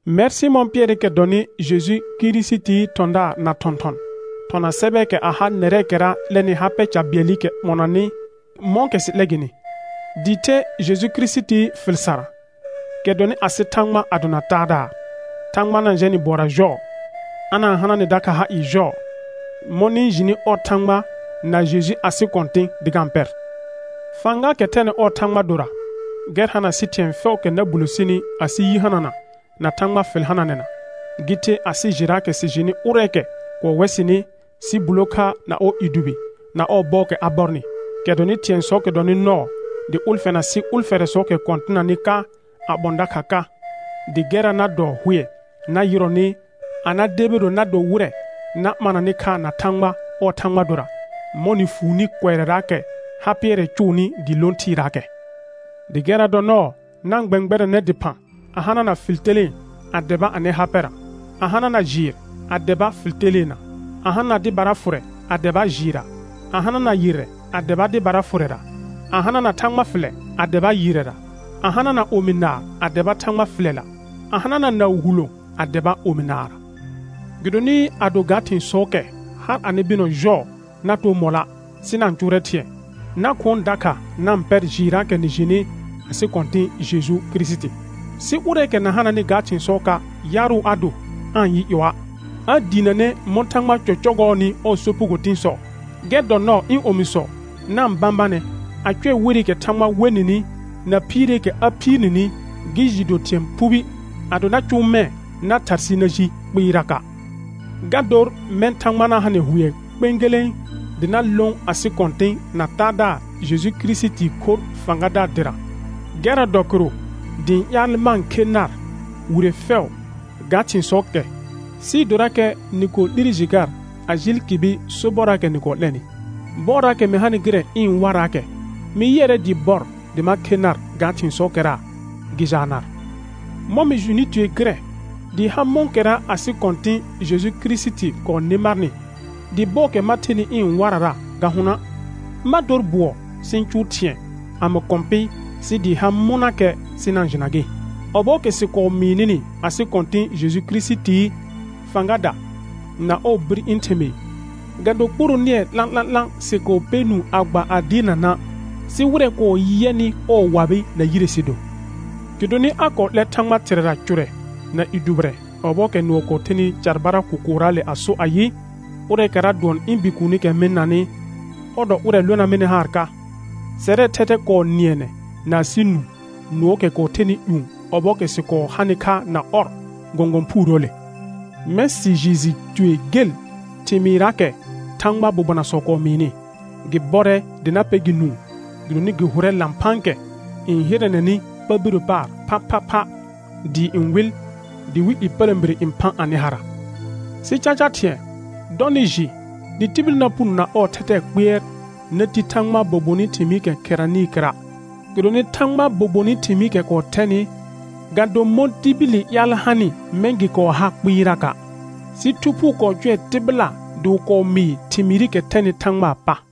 Mɛr Sɩmɔ̃ Pɩɛrɩkɛ dɔnɩ Jeju Kirisitii thɔ̃daar na thɔ̃thɔn, thɔna sɛbɛɛkɛ a ha nɛrɛɛkɛra 'lɛnɩ ha pɛ ca bɩɛlɩkɛ ɓɔnanɩ mɔ̃kɛ sɩ 'lɛ gɩnɩ, dɩɩ the Jeju Kirisitii fɩl sarra, kɛ dɔnɩ asɩ Thãgba a dona Taadaar. Thãgba na-n jɛ nɩ bʋɔra jɔɔ, a na-n hana nɩ dakha ha ɩɩ jɔɔ, mɔ̃ nɩ-n jɩnɩ ɔr Thãgba na Jeju asɩ Kɔ̃tɩ̃ dɩ ga-n pɛr. Fãgaakɛ thɛnɩ ɔɔ Thãgba dora, gɛr hana sɩ thɩ̃ɛ fɛʋʋkɛ na bulo sini asɩ yi hanana na Thãgba fɩl hananɛna, gɩ the asɩ jɩraakɛ sɩ jɩnɩ ʋrɛɛkɛ kɔɔ wɛ sɩnɩ sɩ bulo kha na ɔɔ i dʋbɩ na ɔɔ bɔɔkɛ a bɔrnɩ, kɛ dɔnɩ thɩ̃ɛsɔɔkɛ dɔnɩ nɔɔ dɩ ʋlfɛna sɩ ʋlfɛrɛsɔɔkɛ kɔ̃tɩnanɩ ka a ɓɔ̃ dakha ka, dɩ gɛrra na dɔ hʋɛ na yɩrɔnɩ a na debiro na do wɩrɛ na ɓananɩ kha na Thãgba ɔɔ Thãgba dora, mɔ̃ nɩ fuuni kʋɛrɛraakɛ ha pɩɛrɛ cʋʋnɩ dɩɩ lõ thɩɩraakɛ. Dɩ gɛrra dɔ nɔɔ na-n gbɛ̃gbɛrɛnɛ dɩphã a hanana fɩl telẽe a dɛba anɩ ha pɛra, a hanana jɩɩr a dɛba fɩl teleena, a hanana dɩbara fʋrɛ a dɛba jɩɩrra, a hanana yɩrrɛ a dɛba dɩbara fʋrɛra, a hanana Thãgba fɩlɛ a dɛba yɩrrɛra, a hanana omi naar a dɛba Thãgba fɩlɛla, a hanana naʋ hulõo a dɛba omi naarra. Gɩdonɩ ado ga thɩ̃sɔɔkɛ har anɩ bɩnɔ jɔɔ na too mɔlɔa', sɩ na-n cʋʋrɛ thɩ̃ɛ, na khʋɔn dakha na-n pɛr jɩɩrraakɛ nɩ jɩnɩ asɩ Kɔ̃tɩ̃ Jeju Kirisiti. Sɩ ʋrɛɛkɛ na hananɩ ga thɩ̃sɔɔka', yaarʋ a do, aa-n yɩ ƴɔa', a diinəne mɔ̃ Thãgba cɔcɔgɔɔnɩ ɔɔ sopugo tɩ̃sɔ. Gɛr dɔ nɔɔ ɩ̃ omisɔ, na-n bãbanɛ a cʋɛ werɩkɛ Thãgba we nɩnɩ na phiireekɛ a phiir nini gɩ jɩɩ do thɩ̃ɛ phubi. Ado na cʋʋ mɛ̃ na tharsɩ na ji kpɩɩraka'. Ga dor mɛ̃ Thãgba na ha nɩ hʋɛ kpẽgelẽ dɩ na lõ asɩ Kɔ̃tɩ̃ na Taadaar Jeju Kirisitii khorr fãgadaar dɩra. Gɛrra dɔ kɩrʋ dɩ ɩ̃ ƴaal ma-n khe nar wire fɛʋ ga thɩ̃sɔɔkɛ sɩɩ dorakɛ nɩ kɔɔ 'lire jɩ gar a jɩɩl kɩbɩ sobɔrraakɛ nɩ kɔɔ 'lɛnɩ. Bɔɔraakɛ mɩ hanɩ gɩrɛ ɩ̃ waraakɛ, mɩ yɩɛrɛ dɩɩ bɔr dɩ ma khe nar ga thɩ̃sɔɔkɛra gɩ jaa nar, mɔ̃ mɩ jɩnɩ tue gɩrɛ dɩɩ ha mɔ̃kɛra asɩ Kɔ̃tɩ̃ Jeju Kirisiti kɔɔ nɩ marnɩ, dɩ bɔɔkɛ ma thenɩ ɩ̃ warara ga hʋnɔa'. Ma dor bʋɔ sɩ ɩ̃ cʋʋ thɩ̃ɛ, a mɩ kɔ̃ pɩ sɩ dɩɩ ha mɔnakɛ, sɩ na-n jɩna gɩ. Ɔbɔɔkɛ sɩ kɔɔ mɩɩ nɩnɩ asɩ Kɔ̃tɩ̃ Jeju Kirisitii fãgada na ɔɔ bir ɩ̃ thɩmɩɩ, ga do kpuro nɩɛ 'lã'lã'lã sɩ kɔɔ pɛ nũu a gba a dɩɩrna na', sɩ wɩrɛ kɔɔ yɛnɩ ɔɔ wabɩ na yire sɩ do. Gɩdonɩ a kɔɔ 'lɛr Thãgba Thɩrɛra cʋrɛ na i dʋbɩrɛ ɔbɔɔkɛ nʋɔ kɔɔ thenɩ carbara kʋkʋʋraale a so ayɩ: «Ʋrɛɛkɛra dʋɔn ɩ̃ Bikuunikɛ mɩ-n nanɩ, ɔr dɔ ʋrɛ lona mɩnɩ haar ka.» Sɛrɛɛ thɛthɛ kɔɔ nɩɛnɛ na asɩ nũ nʋɔɔkɛ kɔɔ thɛnɩ ƴũ ɔbɔɔkɛ sɩ kɔɔ hanɩ kha na ɔr gɔ̃gɔ̃ phuurəəle. Mɛ̃ sɩ jɩɩ jɩ tue gel thɩmɩɩrraakɛ Thãgbaa bobonasɔ kɔɔ mɩɩnɩ; gɩ bɔrɛ dɩ na pɛ gɩ nũu, gɩdonɩ gɩ hʋrɛ lãphãakɛ n hɩrɛnɛnɩ pa birə paar phaphapha dɩɩ n wɩl, dɩwɩl ƴepələ̃bire n phã anɩ hara. Sɩ caca thɩ̃ɛ, dɔ nɩ jɩ dɩ tibil na puno na ɔɔ thɛthɛɛ kpɩɛr na ti Thãgbaa bobonɩ thɩmɩɩkɛ kherenenɩɩ kɩra'; gɩdonɩ Thãgbaa bobonɩ thɩmɩɩkɛ kɔɔ thɛnɩ, ga do mɔ̃ tibili ƴaal hanɩ mɛ̃ gɩ kɔɔ ha kpɩɩraka', sɩ Thu Phuu kɔɔ cʋɛ tɩbɩla dɩ wɩ kɔɔ mɩɩ thɩmɩɩrɩkɛ thɛnɩ Thãgbaa pa.